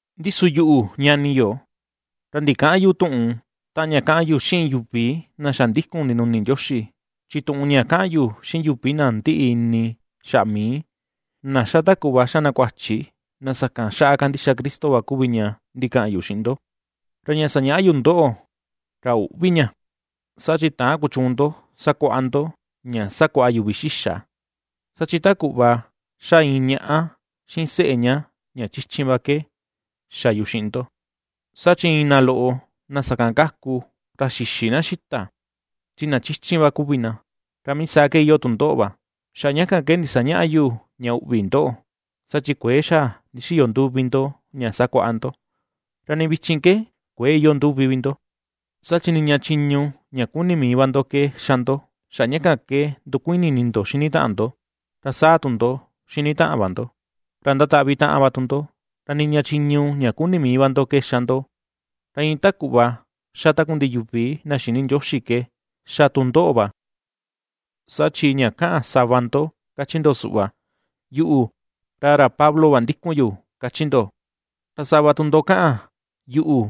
Ndi su yuꞌu, ñani yo, ra ndikäꞌan yu tuꞌun taꞌan ña kaꞌan yu xiꞌin yuvi na xa ndikun ndinuni Ndioxi, chi tuꞌun ña kaꞌan yu xiꞌin yuvi na ndiꞌi ini xaꞌa mii, na ^xa ta kuꞌva ^xa na kuachi, na sakan xaꞌa kandixa Cristo va kuvi ña ndikaꞌan yu xiꞌin ndo. Ra ña sañaꞌa yu ndoꞌo, ra üꞌvi ña, saa chi täan kuchuun ndo sakuaꞌa ndo ña sakuaꞌa yuvi xixa. Saa chi ta kuꞌva ^xá iin ñaꞌa xiꞌin seꞌe ña ña chichin va ke xa yu xiꞌin ndo, saa chi iin na loꞌo na sakan kaku ra xïxi na xita, chi na chichin va kuvi na, ra mii saa ke iyoo tu ndoꞌo va, xaꞌa ña kan ke ndisañäꞌa yu ña uꞌvi ndoꞌo, saa chi kuëe xa ndixiyo nduvi ndo ña sakuaꞌa ndo, ra nii vichin ke kuëe iyoo nduvi vi ndo. Saa chi niña chiñu ña kuni mii va ndo ke ^xa ndo. Xaꞌa ña kan ke ndukuini ini ndo xini taꞌan ndo, ra saa tu ini ndo xini taꞌan va ndo, ra ndataꞌvi taꞌan va tu ndo, ra niña chiñu ña kuni mii va ndo ke xa ndo, ra iin ta kuꞌva ^xa takundiꞌi yuvi na xïni Ndioxi ke xa tu ndoꞌo va. Saa chi ña kaꞌan sava ndo káchí ndo suꞌva: “Yuꞌu, ra ra Pablo va ^ndíku̱n yu”, kachi ndo, ra sava tu ndo kaꞌan: “Yuꞌu,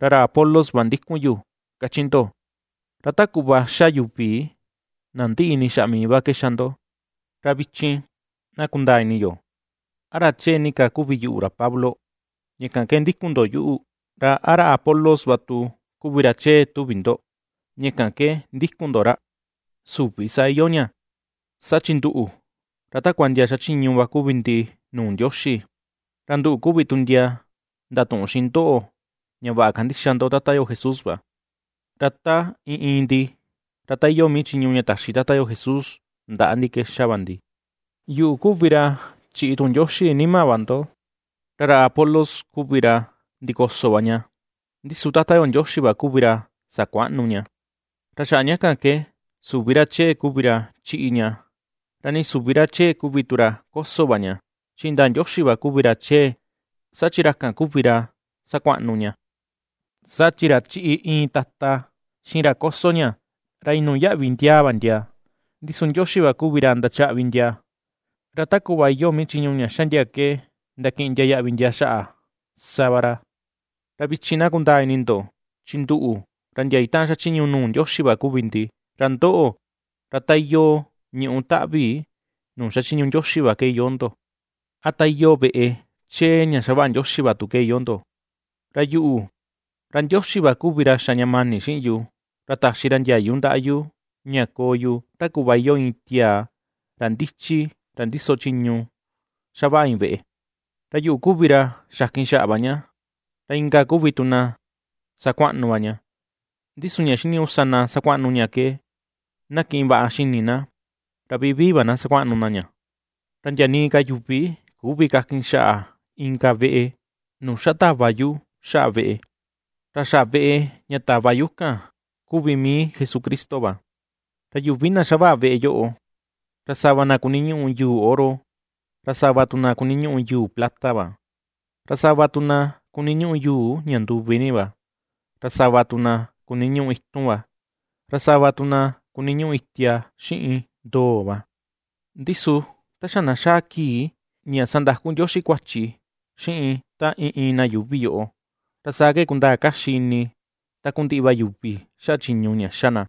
ra ra Apolos va ^ndíku̱n yu”, káchí ndo, ra ta kuꞌva ^xa yuvi na ndiꞌi ini xaꞌa mii va ke ^xa ndo. Ra vichin na kundaa ini yo, ¿a ra chee ni ka kuvi yuꞌu, ra Pablo, ña kan ke ndikun ndo yuꞌu? ¿Ra a ra Apolos va tu kuvi ra chee tuvi ndo, ña kan ke ndikun ndo ra? Süvi saa iyoo ña, saa chi nduꞌu, ra takua ndia xachiñu va kuvi ndi nuu Ndioxi, ra nduꞌu kuvi tu ndia ndatuꞌun xiꞌin ndoꞌo ña vaꞌa kandixa ndo Tata yo Jesús va. Ra ta iin iin ndi ra ta iyoo mii chiñu ña taxi Tata yo Jesús ndaꞌa ndi ke xa va ndi. Yuꞌu kuvi ra chiꞌi tuꞌun Ndioxi nima va ndo, ra ra Apolos kuvi ra ndikoso va ña, ndi su Tata yo Ndioxi va kuvi ra sakuaꞌnu ña. Ra xaꞌa ña kan ke, süvi ra chee vi kuvi ra chíꞌí ña, ra nii süvi ra chee kuvi tu ra kósó va ña, chi indaa Ndioxi va kuvi ra chee, saa chi ra kan va kuvi ra sakuaꞌnu ña. Saa chi ra chíꞌi iin tata xiꞌin ra kósó ña, ra iin nuu yaꞌvi ndiaa va ndia, ndi su Ndioxi va kuvi ra ndachaꞌvi ndia, ra ta kuꞌva iyoo mii chiñu ña ^xa ndia ke ndakiꞌin ndia yaꞌvi ndia xaꞌa, sa va ra. Ra vichin na kundaa ini ndo, chi nduꞌu, ra ndia itaꞌan xachiñu nuu Ndioxi va kuvi ndi, ra ndoꞌo, ra ta iyoo ñuꞌú taꞌvi nuu xachiñu Ndioxi va ke iyoo ndo. A ta iyoo veꞌe chee ña ^xavaꞌa Ndioxi va tu ke iyoo ndo. Ra yuꞌu, ra Ndioxi va kuvi xa ña mani xiꞌin yu, ra taxi ra ndiayu ndaꞌa yu ña koo yu ta kuꞌva iyoo iin tiaa ra ndichi ra ndiso chiñu xavaꞌa iin veꞌe, ra yuꞌu kuvi ra xakin xaꞌa va ña, ra inka kuvi tu na sakuaꞌnu va ña. Ndi su ña xiniñuꞌu sa na sakuaꞌnu ña ke na kiꞌin vaꞌa xini na, ra vivii va na sakuaꞌnu na ña. Ra ndia nii ka yuvi küvi kakin xaꞌa inka veꞌe, nuu xa tava yu xaꞌa veꞌe, ra xaꞌa veꞌe ña tava yu kan kuvi mii Jesucristo va. Ra yuvi na xavaꞌa veꞌe yoꞌo, ra sava na kuniñuꞌu yuu oro, ra sava tu na kuniñuꞌu yuu plata va, ra sava tu na kuniñuꞌu yuu ña nduvi ni va, ra sava tu na kuniñuꞌu itun va, ra sava tu na kuniñuꞌu itia xiꞌin ndoo va. Ndi su ta xa na xaa kii ña sandaku Ndioxi kuachi xiꞌin ta iin iin na yuuvi yoꞌo, ra saa ke kundaa kaxi ini takundiꞌi va yuvi xaꞌa chiñu ña ^xa na;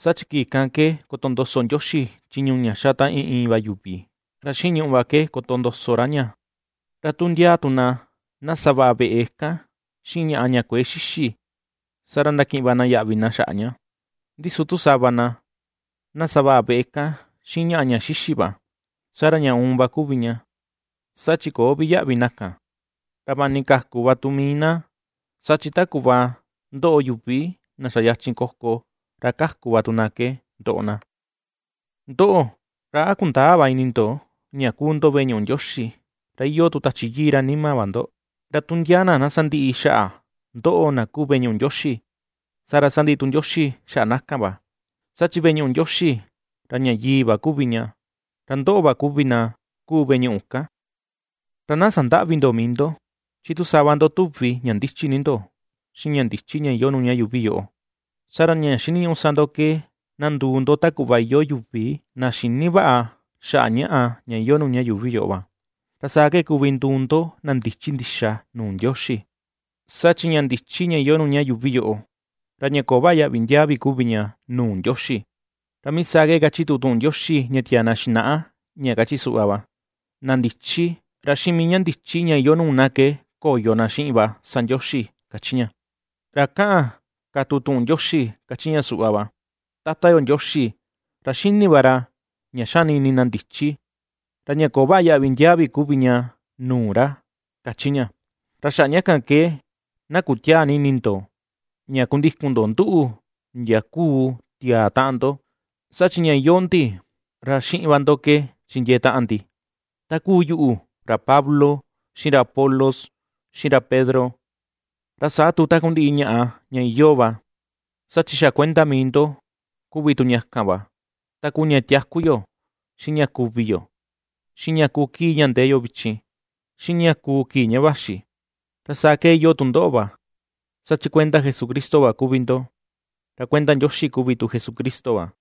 saa chi kii kan ke kotondoso Ndioxi chiñu ña ^xa ta iin iin va yuvi, ra xiꞌin ñùꞌù va ke kotondoso ra ña. Ra tu ndia tu na, na savaꞌa veꞌe kan xiꞌin ñaꞌa ña kuëe xixi, saa ra ndakiꞌin va na yaꞌvi na xaꞌa ña, ndi su tu sava na, na savaꞌa veꞌe kan xiꞌin ñaꞌa ña xixi va, saa ra ña uun va kuvi ña, saa chi köo vi yaꞌvi na kan, ra vaꞌa ni kaku va tu mii na, saa chi ta kuꞌva ^ndoꞌo yuvi na xa yachin koko, ra kaku va tu na ke ndoꞌo na. Ndoꞌo, ¿ra a kundäa va ini ndo ña kuu ndo veꞌe ñuꞌu Ndioxi, ra iyoo tu Tachi Yii ra nima va ndo? Ra tu ndia na na sandiꞌi xaꞌa ndoꞌo na kuu veꞌe ñuꞌu Ndioxi, saa ra sandiꞌi tu Ndioxi xaꞌa na kan va, saa chi veꞌe ñuꞌu Ndioxi ra ña yii va kuvi ña, ra ndoꞌo va kuvi na kuu veꞌe ñuꞌu kan. Ra na sandäꞌvi ndo mii ndo. Chi tu sava ndo tuvi ña ndichi ni ndo xiꞌin ña ndichi ña iyoo nuu ña yuuvi yoꞌo, saa ra ña xiniñuꞌu sa ndo ke na nduu ndo ta kuꞌva iyoo yuuvi na xïni vaꞌa xaꞌa ñaꞌa ña iyoo nuu ña yuuvi yoꞌo va, ra saa ke kuvi nduu ndo na ndichi ndixa nuu Ndioxi. Saa chi ña ndichi ña iyoo nuu ña yuuvi yoꞌo, ra ña köo vaꞌa yaꞌvi ndiaa vi kuvi ña nuu Ndioxi. Ra mii saa ke kachi tu tuꞌun Ndioxi ña tiaa na xinaꞌa, ña kachi suꞌva va: “Na ndichi, ra xiꞌin mii ña ndichi ña iyoo nuu na ke koyo na xiꞌin va sa Ndioxi”, kachi ña. Ra ^kaꞌan ka tu tuꞌun Ndioxi káchí ña suꞌva va: “Tata yo Ndioxi ra xini va ra ña xani ini na ndichi, ra ña köo vaꞌa yaꞌvi ndiaa vi kuvi ña nuu ra”, ^kachi ña. Ra xaꞌa ña kan ke na kutiäa ni ini ndo, ña kundikun ndo nduꞌu ndia kuu tiaa taꞌan ndo, saa chi ña iyoo ndi ra xiꞌin va ndo ke chindiee taꞌan ndi: Ta kuu yuꞌu, ra Pablo, xiꞌin ra Apolos, xiꞌin ra Pedro, ra saa tu takundiꞌi ñaꞌa ña iyoo va, saa chi xa kuenda mii ndo kuvi tu ña kan va: Ta kuu ña tiaku yo, xiꞌin ña kuvi yo, xiꞌin ña ^kuu kii ña ndee yo vichin, xiꞌin ña kuu kii ña vaxi; ra saa ke iyoo tu ndoꞌo va, saa chi kuenda Jesucristo va kuvi ndo, ra kuenda Ndioxi kuvi tu Jesucristo va.